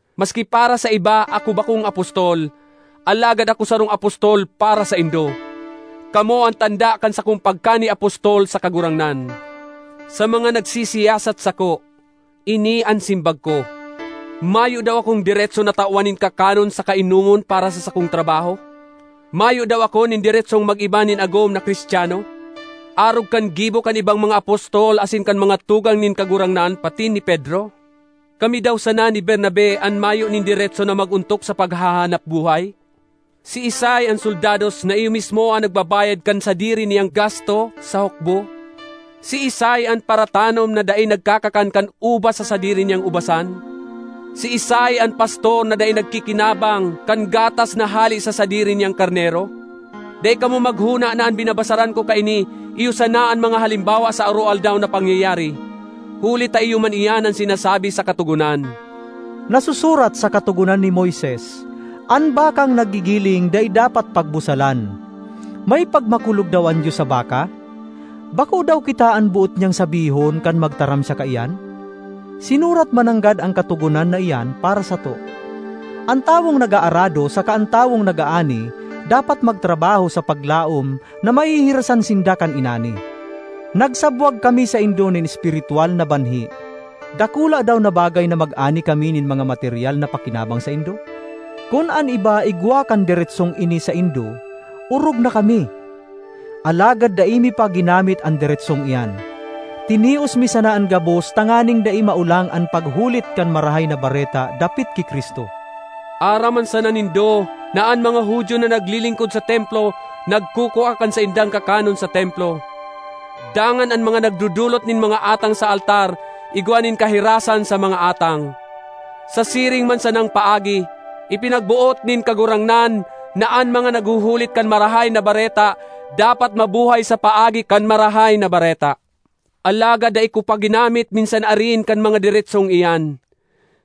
Maski para sa iba ako bakong apostol, alagad ako sarong apostol para saindo! Kamo an tanda kan sakong pagkani-apostol sa Kagurangnan. Sa mga nagsisiyasat sako, ini an simbag ko: Mayo daw akong deretso na tawan nin kakanon saka inomon para sa sakong trabaho? Mayo daw ako nin deretsong mag-iba nin agom na Cristiano, arog kan gibo kan ibang mga apostol asin kan mga tugang nin Kagurangnan patin ni Pedro? Kami daw sana ni Bernabe an mayo nin deretso na mag-ontok sa paghahanap buhay? Siisay an soldados na iyo mismo an nagbabayad kan sadiri niyang gasto sa hukbo? Siisay an paratanom na dai nagkakakan kan ubas sa sadiri niyang ubasan? Siisay an pastor na dai nagkikinabang kan gatas na hale sa sadiri niyang karnero? Dai kamo maghona na an binabasaran ko kaini iyo sana an mga halimbawa sa aroaldaw na pangyayari, huli ta iyo man iyan an sinasabi sa Katogonan. Nasusurat sa Katogonan ni Moises, “An bakang naggigiling dai dapat pagbusalan.” May pagmakulog daw an Dios sa baka? Bako daw kita an boot niyang sabihon kan magtaram siya kaiyan? Sinurat mananggad an katogonan na iyan para sato. An tawong nag-aarado saka an tawong nag-aani dapat magtrabaho sa paglaom na mahihirasan sinda kan inani. Nagsabwag kami saindo nin espiritwal na banhi. Dakula daw na bagay na mag-ani kami nin mga materyal na pakinabang saindo? Kun an iba igwa kan deretsong ini saindo, orog na kami! Alagad dai mi pa ginamit an deretsong iyan. Tinios mi sana an gabos tanganing dai maolang an paghulit kan Marahay na Bareta dapit ki Cristo. Aram man sana nindo na an mga Judio na naglilingkod sa Templo nagkukua kan saindang kakanon sa Templo, dangan an mga nagdodolot nin mga atang sa altar igwa nin kahirasan sa mga atang. Sa siring man sanang paagi, ipinagboot nin Kagurangnan na an mga naghuhulit kan Marahay na Bareta dapat mabuhay sa paagi kan Marahay na Bareta. Alagad dai ko pa ginamit minsan arin kan mga deretsong iyan,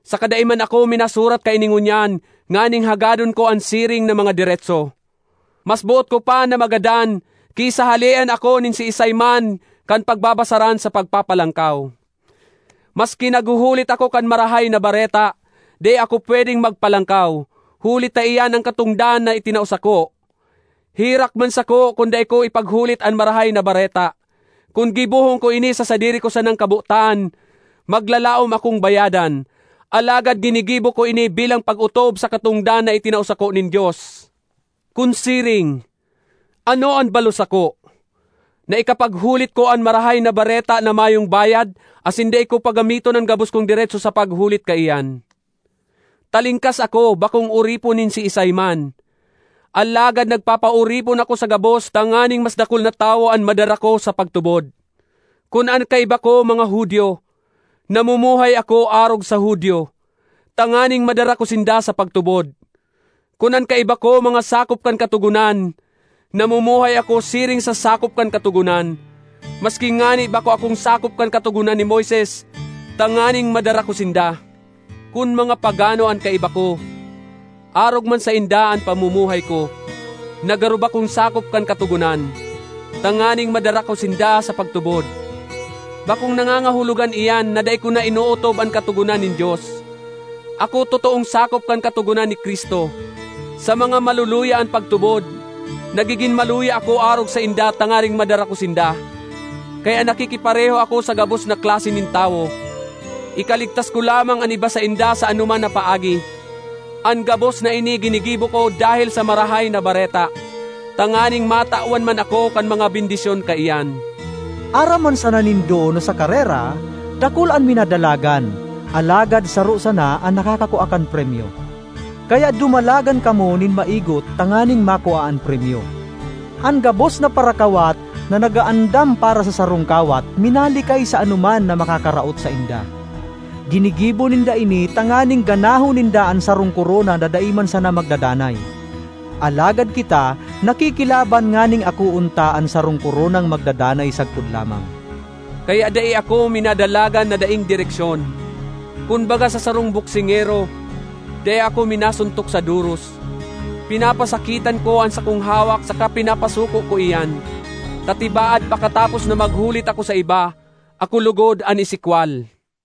saka dai man ako minasurat kaini ngunyan nganing hagadon ko an siring na mga deretso. Mas boot ko pa na magadan ki sa halean ako nin siisay man kan pagbabasaran sa pagpapalangkaw. Maski naghuhulit ako kan Marahay na Bareta, dai ako pwedeng magpalangkaw, huli ta iyan an katongdan na itinao sako. Herak man sako kun dai ko ipaghulit an Marahay na Bareta! Kun gibohon ko ini sa sadiri ko sanang kabotan, maglalaom akong bayadan; alagad ginigibo ko ini bilang pag-otob sa katongdan na itinao sako nin Dios. Kun siring, ano an balos sako? Na ikapaghulit ko an Marahay na Bareta na mayong bayad asin dai ko paggamiton an gabos kong deretso sa paghulit kaiyan. Talingkas ako, bakong oripon nin siisay man; alagad nagpapaoripon ako sa gabos tanganing mas dakul na tawo an madara ko sa pagtubod. Kun an kaiba ko mga Judio, namumuhay ako arog sa Judio, tanganing madara ko sinda sa pagtubod. Kun an kaiba ko mga sakop kan Katogonan, namumuhay ako siring sa sakop kan Katogonan, maski ngani bako akong sakop kan Katogonan ni Moises, tanganing madara ko sinda. Kun mga pagano an kaiba ko, arog man sainda an pamumuhay ko, na garo bakong sakop kan Katogonan, tanganing madara ko sinda sa pagtubod. Bakong nangangahulugan iyan na dai ko na inootob an katogonan nin Dios; ako totoong sakop kan katogonan ni Cristo. Sa mga maluluya an pagtubod, nagigin maluya ako arog sainda tanganing madara ko sinda. Kaya nakikipareho ako sa gabos na klase nin tawo, ikaligtas ko lamang an iba sainda sa anoman na paagi. An gabos na ini ginigibo ko dahel sa Marahay na Bareta, tanganing matawan man ako kan mga bendisyon kaiyan. Aram man sana nindo na sa karera, dakul an minadalagan, alagad saro sana an nakakakua kan premyo. Kaya dumalagan kamo nin maigot tanganing makua an premyo. An gabos na parakawat na nag-aandam para sa sarong kawat minalikay sa anoman na makakaraot sainda; ginigibo ninda ini tanganing ganahon ninda an sarong korona na dai man sana magdadanay. Alagad kita nakikilaban nganing akoon ta an sarong koronang magdadanay sagkod lamang. Kaya dai ako minadalagan na daing direksyon. Kun baga sa sarong boksingero, dai ako minasuntok sa doros. Pinapasakitan ko an sakong hawak saka pinapasuko ko iyan, ta tibaad pakatapos na maghulit ako sa iba, ako logod an isikwal.